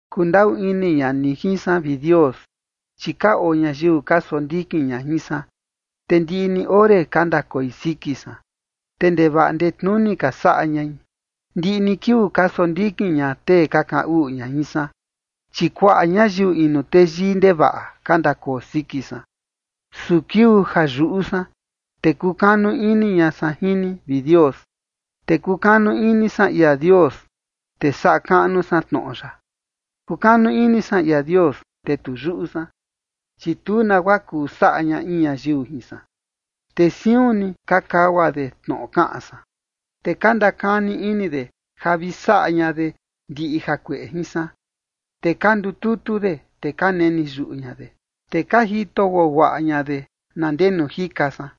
Kundaꞌu ini ña ni jin san, vi Dios, chi ka oo ñayiu ka sondikin ña jin san, te ndiꞌi ni ore ka ndakoi siki san, te ndevaꞌa ndetnuni ka saꞌa ñai. Ndiꞌi ni kiuu ka sondikin ña tee ka kaꞌan uꞌu ña jin san, chi kuaꞌa ñayiu inu teyii ndevaꞌa ka ndakoo siki san. Su kiuu ja yuꞌu san, te kukanu ini ña san jin ni, vi Dios. Te kukanu ini san ia Dios, te saꞌa kaꞌnu san tnoꞌo ya. Kukanu ini san ia Dios, te tu yuꞌu san, chi tu nagua kuu saꞌa ña in ñayiu jin san. Te siun ni ka kagua de tnoꞌo kaꞌan san, te ka ndakani ini de ja vi saꞌa ña de ndiꞌi jakueꞌe jin san. Te ka ndututu de, te ka neni yuꞌu ña de, te ka jito guaguaꞌa ña de na ndenu jika san,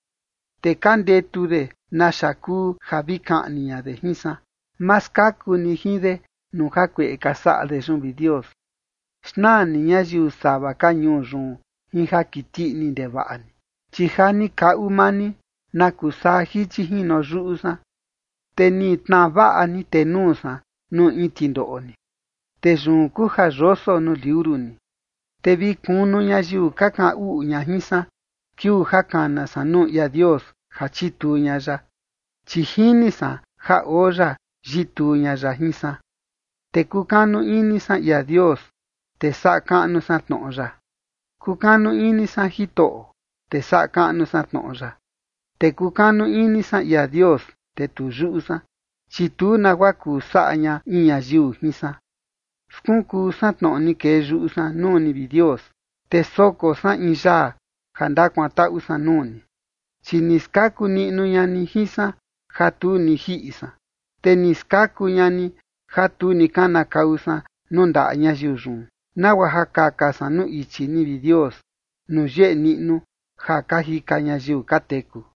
te ka ndetu de naxa kuu ja vi kaꞌni ña de jin san. Ma skaku ni jin de nuu jakueꞌe ka saꞌa de yun, vi Dios. Xnaa ni ñayiu sava ka ñuu yun jin ja kiti ini ndevaꞌa ni. Chi ja ni kaꞌu maa ni na kusaa jichi jino yuꞌu san, te ni tnaa vaꞌa ni tenuu san nuu in tindoꞌo ni, te yun kuu ja yoso nuu liuru ni. Te vi kunu ñayiu ka kaꞌan uꞌu ña jin san kiuu ja kana san nuu ia Dios ja chituu ña ya, chi jini san ja oo ya yituu ña ya jin san. Te kukanu ini san ia Dios, te saꞌa kaꞌnu san tnoꞌo ya. Kukanu ini san Jitoꞌo, te saꞌa kaꞌnu san tnoꞌo ya. Te kukanu ini san ia Dios, te tu yuꞌu san, chi tu nagua kuu saꞌa ña in ñayiu jin san. Skunkuu san tnoꞌo ni kee yuꞌu san nuu ni, vi Dios, te soko san in yaa ja ndakuantaꞌu san nuu ni. Chi ni skaku niꞌnu ña ni jin san ja tu ni jiꞌi san, te ni skaku ña ni ja tu ni kanakau san nuu ndaꞌa ñayiu yun, nagua ja kaka san nuu ichi ni, vi Dios, nuu yeꞌe niꞌnu ja ka jika ñayiu ka teku.